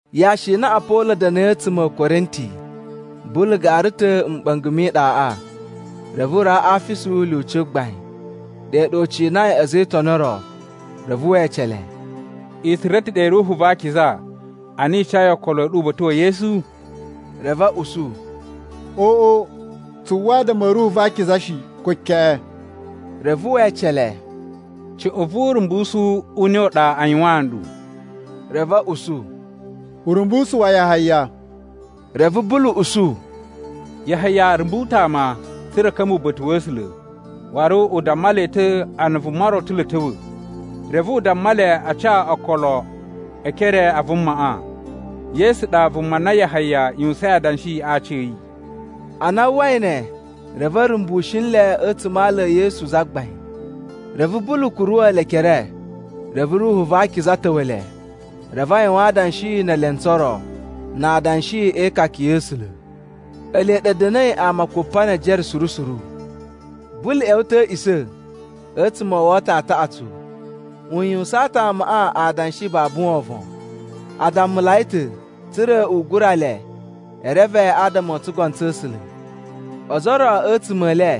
Yashi i na Apolo da̱na̱i a̱tsuma̱ a̱ Korinti, Bulu gara ta̱ a̱ mɓa̱nga̱ mi iɗaꞌa, reve u rawa Afisu lyuci gbain. Ɗe ɗa u cinai a̱za̱ e Itoni o ro. Reve we ece le, “I tsura̱ ta̱ ɗe Ruhu va Akiza a na i cayi okolo a̱ ɗu uba̱ta̱ wa̱ Yesu?” Reve a̱ usu, “Oꞌo, tsu uwwa adama a̱ Ruhu va Akiza shi, ko keꞌen.” Reve we ece le, “Cuꞌun vu urumbusu u ne u ɗa a yuwaan nɗu?” Reve a̱ usu, “Urumbusu wa Yahaya.” Reve Bulu usu, “Yahaya rumbu ta̱ ama, tsa̱ra̱ a̱ ka̱mba̱ uba̱ta̱ wa̱ A̱sula̱. Waru u damma le ta̱ a na vuma ro ta̱ lo a̱ ta̱wa̱, reve u damma le a ca okolo e ekere a vumaꞌa. Yesu ɗa vuma na Yahaya yuwusain adanshi a aci a̱ yi.” Ana a uwwai ne, reve a̱ rumbushi nle a̱tsuma̱ a ala e Yesu Zagbain. Reve Bulu kuruwa̱ le ekere, reve Ruhu va Akiza ta̱wa̱ le. Reve a yuwan adanshi ne elentsu o ro, na adanshi e ikaka ya̱ A̱sula̱. Ele ɗa a̱ da̱na̱i ama kupa ne ejere suru suru. Bulu ꞌya̱wa̱ ta̱ a̱ a̱a̱ꞌisa̱, a̱tsuma̱ o woto taꞌatsu u yuwusaan ta̱ amaꞌa adanshi babu wovon. A dammulai ta̱, tsa̱ra̱ u gura le e reve adama o tsugono tsa̱ A̱sula̱. Ozo o ro a̱tsuma̱ e le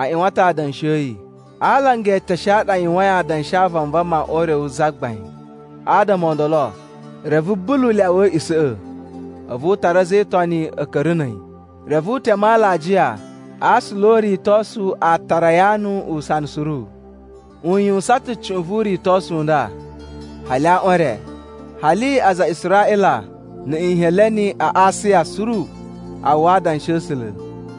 a ꞌyuwan ta̱ adanshi a̱ yi, a alanga e eteshe a ɗa a yuwain adanshi a vanvama o Ure wu Zagbain. Adama o ndolo, reve Bulu lyawa a̱a̱ꞌisa̱ꞌa̱, a̱vu u tara a̱za̱ e Itoni a̱ ka̱ra̱ na̱ a̱yi. Reve u teme alajiya a aasula o uritosu a Tayaranu usana suru. U yuwusan ta̱ cuꞌun vu uritosu u nda, hali aꞌwan e re, hali aza a Israꞌila na̱ Nheleni a Asiya suru a uwwa adanshi a̱ A̱sula̱.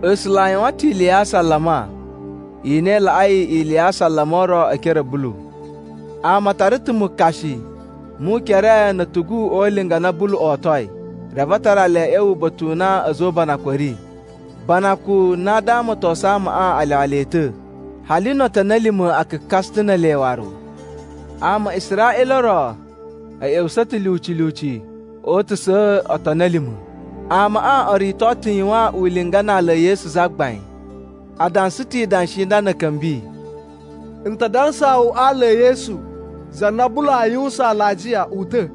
A̱sula̱ a yuwan ta̱ ili ya asalama i na i laꞌai ili ya asalama o ro e ekere a̱ Bulu. Ama a tara ta̱ mukashi mu ukere na̱ a̱tugu o ulinga a na Bulu otoi, reve a tara le a̱ ꞌya̱wa̱ uba̱ta̱ u na a̱za̱ o ubanakun a̱ ri. Banakun na damatosuyi amaꞌa a lyawa le ta̱, hali no otoni a̱ lima̱ a kakasa ta̱ ne ele waru. Ama a Israꞌila o ro a̱ ꞌya̱wusa̱ ta̱ lyuci lyuci o utusa̱a̱ otoni a̱ lima̱. Amaꞌa o rito ta̱ yuwan ulinga na ala e Yesu Zagbain. A dansa ta̱ idanshi i nda na̱ a̱ ka̱mbi: “N ta dansaa wu a ala e Yesu, za na Bulu aa yuwusan alajiya, uta̱!”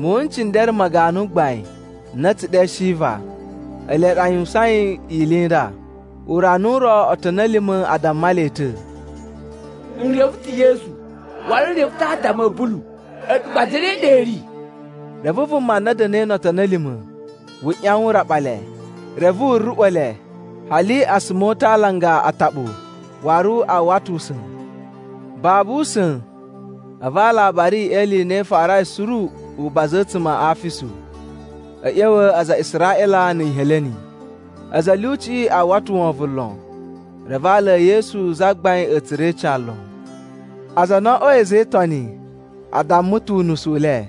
Muwun n cindere ma ganu gbain na a̱ tsu ɗe Shiva, ele ɗa a yuwusain ili i nda. Urana u ro, otoni a̱ lima̱ a damma le ta̱, “N reve ta̱ Yesu! Waru n reve ta̱ adama a̱ Bulu. A̱ɗu gba zane ɗa i ri?” Reve vuma na da̱na̱i no otoni a̱ lima̱ wu ꞌyawan u raɓa le, reve wu ruꞌwa̱ le, hali a suma o uta̱ a alanga ataɓu, waru a uwwa ta̱ usa̱n. Babu usa̱n, a̱vu alabari e ili i na i farai suru, u baza a̱tsuma̱ a Afisu, a̱ ꞌya̱wa̱ aza a Israꞌila na̱ Nheleni. A̱za̱ a̱ lyuciꞌi a uwwa ta̱ wovon lon, reve ala e Yesu Zagbain a̱ tsura̱ ica lon. Aza a na o oꞌwoi a̱za̱ e Itoni a damma ta̱ unusu u le.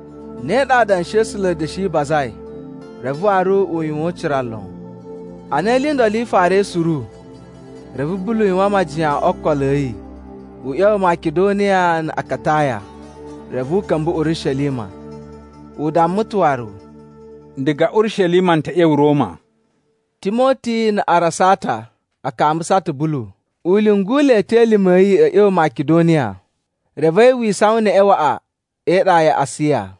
Ne ɗa adanshi a̱ A̱sula̱ a̱ da̱shi bazai, reve waru u yuwan ucira lon. Ana ili i ndolo i farai suru, reve Bulu yuwan majiyan o okolo a̱ yi u ꞌya̱wa̱ Makidoniya na̱ Akataya, reve u ka̱mba̱ Urishelima. U damma ta̱ waru, “Diga Urishelima n ta̱ ꞌya̱wa̱ Roma.” Timoti na̱ Arasata a kambusa ta̱ Bulu. U lyungu le ta̱ elime a̱ yi a̱ ꞌya̱wa̱ Makidoniya, reve a̱yi wi isawan neꞌen waꞌa e iɗa ya Asiya.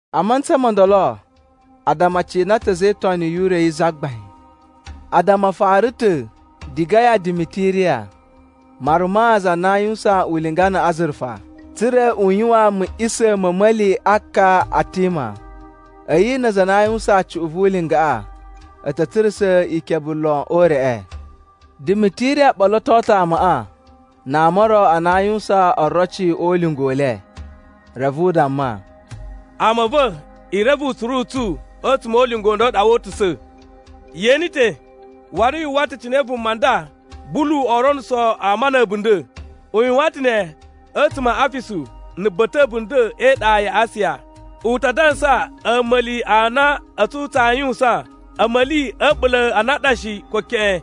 A mantsa mo ndolo addama a cina ta̱ a̱za̱ e Itoni yu Ure yi Zagbain. Addama a fara ta̱ diga ya Dimitiriya, maruma za na aa yuwusan ulinga na̱ azurufa tsa̱ra̱ u yuwan muꞌisa̱ ma̱ a̱a̱ma̱li a ka Atima. A̱yi na aza a na a yuwusan cuꞌun vu ulingaꞌa a̱ ta̱ tsurusa̱ ikebe lon o ureꞌe. Dimitiriya ɓoloto ta̱ amaꞌa na ama o ro a na a yuwusan oroci o ulinga u le, reve u damma, “Ama a̱ va̱, i reve utsuru u tsu a̱tsuma̱ o ulinga u nda u ɗa woo utusa̱. Ye ene ta̱, waru yu uwwa ta̱ cine vuma nda Bulu oo ronuso ama na̱ a̱bunda̱. U yuwan ta̱ ne a̱tsuma̱ a Afisu, na̱ ba̱ta̱ a̱bunda̱ e iɗa ya Asiya. U ta dansa a̱ma̱li a na a̱tsu tsaa yuwusan, a̱ma̱li a̱ a̱ɓula̱ a na a ɗa shi, ko keꞌen.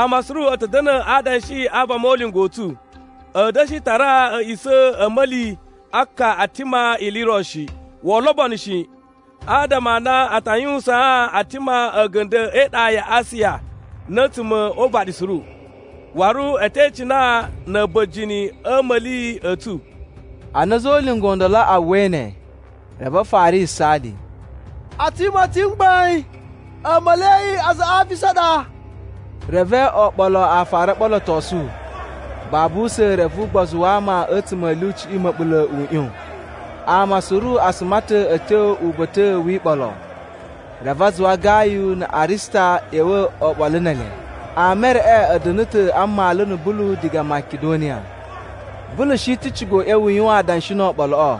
Ama suru a̱ ta̱ da̱na̱ a adanshi a vama o ulinga u tsu. A̱a̱ da̱shi tara a̱a̱ꞌisa̱ a̱ a̱a̱ma̱li a ka Atima ili i ro shi. Woo lobono shi, adama a na a ta yuwusaan Atima a̱ga̱nda̱ e iɗa ya Asiya na̱ a̱tsuma̱ o uvaɗi suru. Waru a̱ te icina na̱ a̱ba̱jini a̱ a̱a̱ma̱li a̱ tsu!” Ana a̱za̱ o ulinga o ndolo a uwwai ne, reve a fara yisaali, “Atima ta̱ mgbain, a̱a̱ma̱li a aza a Afisu a ɗa!” Reve oɓolo a fara o ɓolotosu, babu usa̱n reve ugbozu wa ama a̱tsuma̱ a̱ lyuciꞌi ma̱ɓula̱ u ꞌyon. Ama suru a suma ta̱ a̱ tyo uba̱ta̱ wi iɓolo. Reve a zuwa Gayu na̱ Arista ꞌya̱wa̱ oɓolo ne ele. Ama e reꞌe a̱ da̱na̱ ta̱ a mmalu na̱ Bulu diga Makidoniya. Bulu shi ta̱ ciga u ꞌya̱wa̱ u yuwan adanshi no oɓoloꞌo,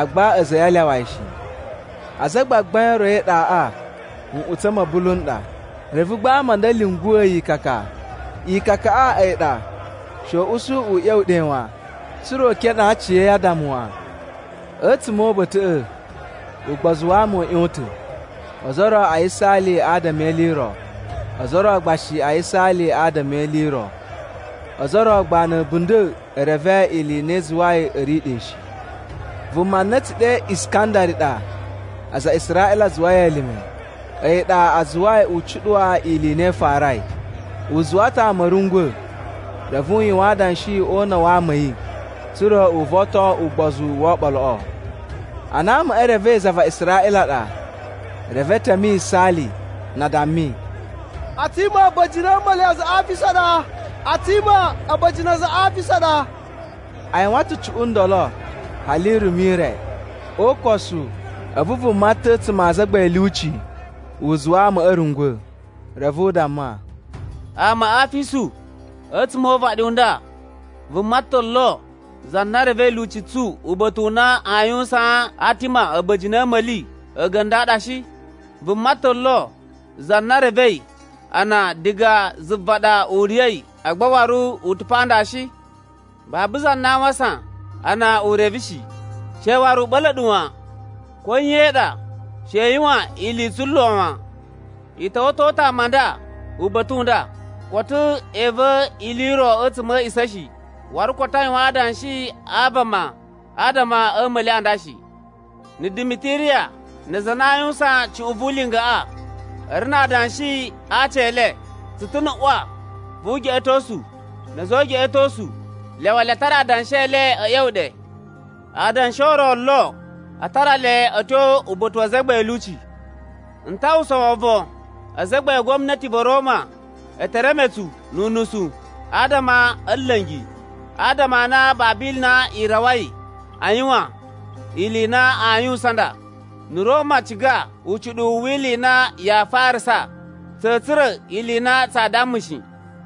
agba a̱za̱ a̱ yi a lyawa yi shi. Azagbagbain o ro e iɗaꞌa nꞌutsa̱ ma̱ Bulu n ɗa. Reve gba ama a nda a̱ lyunguwa̱ yi ikaka. Ikakaꞌa a̱yi ɗa she u usu u ꞌya̱wa̱ ɗe wan, tsa̱ra̱ u kenee aciya̱yi addama wan. A̱tsuma̱ o uba̱ta̱ꞌa̱, ugbozu wa ama u ꞌyon ta̱. Ozo o ro a yisaali adama e ili i ro, ozo o ro gba shi a yisaali adama e ili i ro. Ozo o ro gba na̱ a̱bunda̱ e reve ili i na i zuwai a̱ ri ɗe shi. Vuma na a̱ tsu ɗe Iskandari ɗa aza a Israꞌila a zuwai elime, a̱yi ɗa a zuwai u cuɗuwa ili i na i farai. U zuwa ta̱ ama a̱ rungwa̱, reve u yuwan adanshi o una̱ wa ama a̱ yi tsa̱ra̱ u voton ugbozu wo oɓoloꞌo. Ana amaꞌa e revei za va Israꞌila ɗa, reve e teme yisaali, na a dammi, “Atima a̱ba̱jini a̱ a̱a̱ma̱li a aza a Afisu ɗa! Atima a̱ba̱jini a aza a Afisu ɗa!” A yuwan ta̱ cuꞌun ndolo hali irumu i re. O ukosu, a̱vu vuma ta̱ a̱tsuma̱ a azagbain a̱ lyuci u zuwa amaꞌa a̱ rungwa̱. Reve u damma, “Ama a Afisu, a̱tsuma̱ o uvaɗi u nda vuma ta̱ lo za na revei lyuci tsu uba̱ta̱ u na aa yuwusaan Atima a̱ba̱jini a̱ a̱a̱ma̱li a̱ga̱nda̱ a ɗa shi? Vuma ta̱ lo za na revei ana diga zuva ɗa u riya̱i agba waru u ta̱ pa nda shi? Babu za na a wasan a na u reve shi. She waru u ɓa̱la̱ ɗu wan. Ko nye i ɗa, she i yuwan ili i tsulo wan. “I ta̱wa̱to ta̱ ama a nda uba̱ta̱ u nda, koto e iva̱ ili i ro a̱tsuma̱ a̱ a̱a̱ꞌisa̱ shi, waru koto a yuwan adanshi a vama adama a̱ a̱a̱ma̱li a nda shi. Na̱ Dimitiriya na aza a na aa yuwusan cuꞌun vu ulingaꞌa a̱ ri na adanshi a aci e le, tsu ta̱ na̱ ꞌwa vu ugeꞌetosu na̱ a̱za̱ o ugeꞌetosu. Lyawa le a tara adanshi e le a̱ ꞌya̱wa̱ ɗe. Na adanshi o ro o lo, a tara le a̱ tyo uba̱ta̱ wa azagbain a̱ lyuci. “N ta uwwusa wovon azagbain a gwamnati va̱ Roma e te reme tsu nu unusu adama a̱ nla̱ngi, adama a na babu ili i na i rawai a yuwan ili i na aa yuwusan nda. Na̱ Roma ciga ucuɗuwu wi ili i na yaa farasa, tsa̱a̱ tsura̱ ili i na tsaa damma shi.”